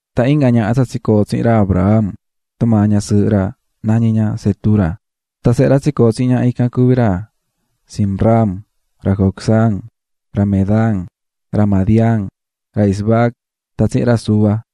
Tan inga ñaha tsa tsicoo̱ tsihin ra Abraham tumaa ñasɨɨhɨ ra, nañí ña Cetura. Tan sehe ra tsicoo̱ tsihin ñaha ican cuví ra Zimram, ra Jocsán, ra Medán, ra Madián, ra Isbac tan tsihin ra Súa.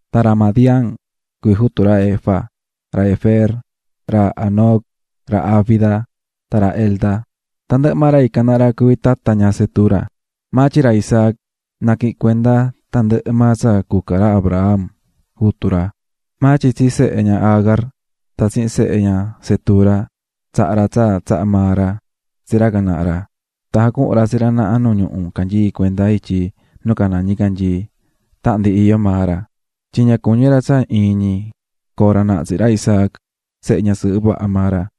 Tan ra Madián, cuví jutu ra Efa, ra Efer, ra Hanoc, ra Abida, tan ra Elda. Tandɨhɨ maa ra ican naha ra cuví tata ña Cetura. Maa tyin ra Isaac naquihi̱n cuenda tandɨhɨ maa tsa cuca ra Abraham, jutu ra. Maa tyin tsi sehe ña Agar tan tsihin sehe ña Cetura, tsaha̱ ra tsa tsaha̱ maa ra tsi ra can naha ra. Tan jacuhu̱n ra tsi ra naha nu ñuhu canyií cuenda ityi nu caná ñicanyii tahan ndi iyó maa ra, tyin ña cuñí ra tsa iin ñi coo ra naha tsihin ra Isaac sehe ñasɨɨhɨ vaha maa ra.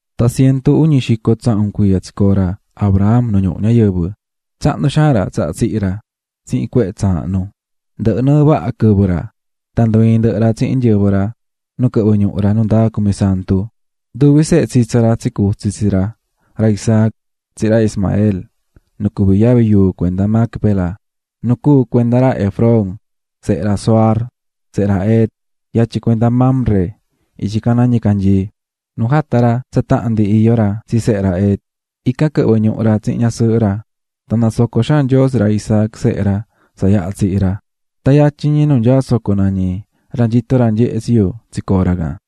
Tan cientu uñi xico tsahun cuiya tsicoo̱ ra Abraham nu ñuhu ñayɨvɨ. Tsahnu xaan ra tsaha tsihi̱ ra tsihin cuehe tsaahnu, ndɨhɨ̱ nɨɨ vaha quɨvɨ ra. Tan ndu ii̱n ndɨhɨ ra tsihin nyɨvɨ ra nu quɨhvɨ̱ ñuhu ra nu ndaa cumisantu. Nduvi sehe tsitsa ra tsicutsi̱ tsi ra, ra Isaac tsihin ra Ismael nu cuví yavi yuu cuenda Macpela, nu cuu̱ cuenda ra Efrón, sehe ra Zohar, sehe ra Het, yatyin cuenda Mamre ityi caná ñicanyii, nu jata̱ ra tahan ndi iyó ra tsi sehe ra Het, ican quɨhvɨ̱ ñuhu ra tsihin ñasɨɨhɨ ra. Tan nasoco̱ xaan Nyoo tsi ra Isaac sehe ra tsa yaha tsihi̱ ra. Tan yatyin nu nyaá soco nañí "Ra nyitó ra nyehé tsi yu" tsicoo̱ ra can.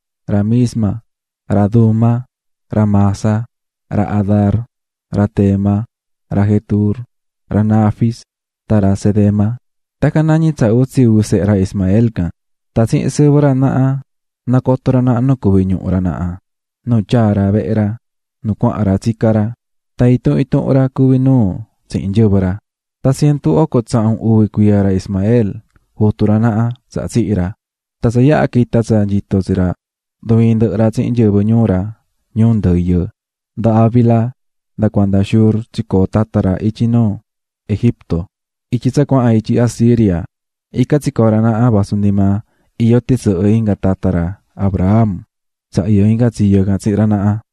ra Misma, ra Duma, ra Massa, ra Hadar, ra Tema, ra Jetur, ra Nafis tan ra Cedema. Tacan nañí tsa utsi uvi sehe ra Ismael can. Tan tsihin sɨvɨ ra naha nacotó ra naha nu cuví ñuhu ra naha tan nu tyaa̱ ra vehe ra nu cuahan ra tsicá ra. Tan intuhun intuhun ra cuví nuu tsihin nyɨvɨ ra. Tan cientu oco tsahun uvi cuiya ra Ismael, jutu ra naha, tsaha tsihi̱ ra, tan tsa yaha quita̱ tsa nyito tsi ra ndu ii̱n ndɨhɨ ra tsihin nyɨvɨ ñuu ra ñuu ndɨyɨ. Nda Havila nda cuanda Shur tsicoo̱ tata ra ityi nuu Egipto, ityi tsa cuahan ityi Asiria. Ican tsicoo̱ ra naha vasu ndi maa iyó tisɨhɨ inga tata ra Abraham tsa iyó inga tsiyo can tsihin ra naha.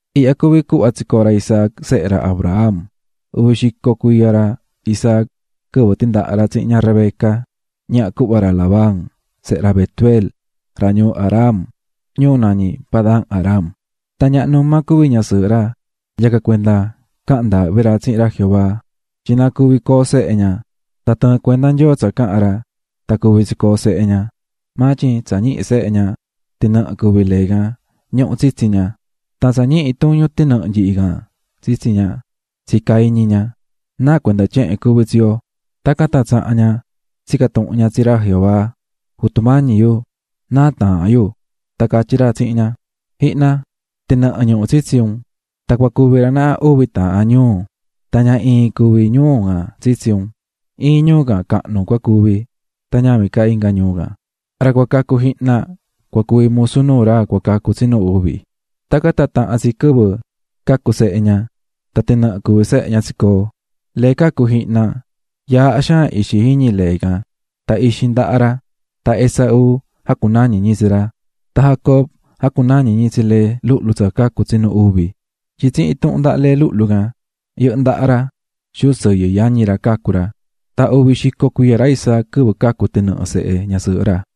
Ihya cuví cuhva tsicoo̱ ra Isaac sehe ra Abraham: Uvi xico cuiya ra Isaac quɨvɨ tindaha̱ ra tsihin ña Rebeca, ñaha cuhva ra Labán, sehe ra Betuel, ra ñuu Aram, ñuu nañí Padan-aram. Tan ñaha numa cuví ñasɨɨhɨ ra, yacan cuenda caha̱n ndaahvi ra tsihin ra Jehová tyin na cuvi coo sehe ña. Tan tɨɨ̱n cuenda Nyoo tsa caha̱n ra, tan cuvi̱ tsicoo̱ sehe ña. Maa tyin tsa ñihi̱ sehe ña tinɨhɨ cuví lee can ñuhú tsitsi ña, tan tsa ñihi tuñú tinɨhɨ nyihi can tsitsi ña, tsica̱ iñi ña: "Náa cuenda tyehen cuví tsi yo". Tacan tan tsaha̱n ña tsica̱ tuhun ña tsi ra Jehová: "Jutu mañi yu náa taahán yu". Tan catyí ra tsihin ña: "Ji̱hna, tinɨhɨ ñuhú tsitsi un tan cua cuvi ra naha uvi taahan ñuu, tan ña iin cuví ñuu can tsitsi un, Iin ñuu can cahnu cua cuvi tan ñavin ca inga ñuu can, ra cua cacu jihna cua cuvi musu nuu ra cua cacu tsinu uvi." Tacan tan tahan tsi quɨvɨ cacu̱ sehe ña, tan tinɨhɨ cuví sehe ña tsicoo̱. Lee cacu̱ jihna, yaaha xaan ixi jiñi lee can tan ixi ndaha ra, tan Esaú jacunañi̱ ñi tsi ra. Tan Jacob jacunañi̱ ñi tsi lee luhlu tsa cacu̱ tsinu uvi, tyin tsihin intuhun ndaha lee luhlu can yɨhɨ́ ndaha ra xuu sɨyɨ yañi ra cacu̱ ra. Tan uñi xico cuiya ra Isaac quɨvɨ cacu̱ tinɨhɨ sehe ñasɨɨhɨ ra.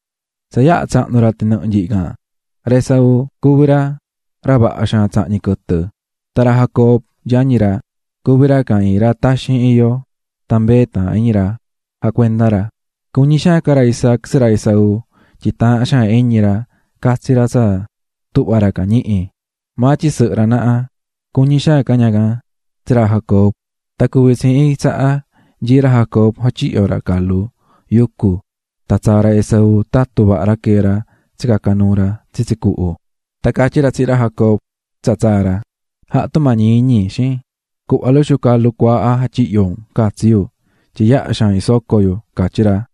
Tsa yaha tsahnu̱ ra tinɨhɨ nyihi can, ra Esaú cuví ra, ra vaha xaan tsahñí quɨtɨ. Tan ra Jacob, yañi ra, cuví ra can iin ra taxin iyó, tan mbee taahán iñi ra jacuendá ra. Cuñí xaan ca ra Isaac tsi ra Esaú tyin taahán xaan iñi ra catsi ra tsa tuhvá ra can ñihí, maa tyin sɨhɨ ra naha cuñí xaan ca ña can tsi ra Jacob. Tan cuvi̱ tsi iin tsaha nyií ra Jacob jatyihyó ra calu yucu, tan tsaa̱ ra Esaú tatú vaha ra quee̱ ra tsicaca̱ nuu ra tsitsi cuhu, tan catyí ra tsihin ra Jacob tsa tsaa̱ ra: --Ja̱ha tumañi iñi, xiin, cu̱hva luxu calu cuaaha jatyihyo̱ un juvin catsi yu tyin yaha xaan isocó yu --catyí ra.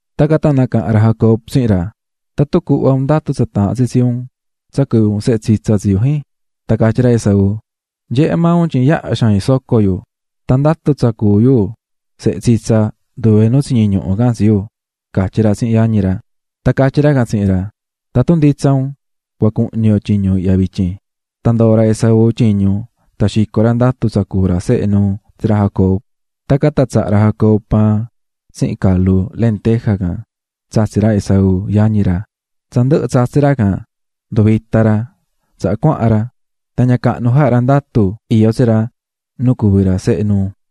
Tacan tan nacaha̱n ra Jacob tsihin ra: --¿Tatun cuhva un ndatu tsa taahán tsi tsi un tsa cuví un sehe tsitsa tsi yu, jin? Tan catyí ra Esaú: --Nyehé maa un tyin yaha xaan isocó yu, tan ndatu tsa cuú yu sehe tsitsa nduve nu tsiñi ñuhu can tsi yu --catyí ra tsihin yañi ra. Tan catyí ra can tsihin ra: --Tatun nditsa un cua cuhñi yo tyiñu ihya vityin. Tan ndoo̱ ra Esaú tyiñu, tan xico̱ ra ndatu tsa cuú ra sehe nuu tsi ra Jacob. Tacan tan tsaha̱ ra Jacob paan tsihin calu lentejaf4 can tsatsi̱ ra Esaú, yañi ra. Tsa ndɨhɨ̱ tsatsi̱ ra can nduvita̱ ra, tsaha cuahan ra. Tan ña cahnu jaha̱ ra ndatu iyó tsi ra nu cuví ra sehe nuu.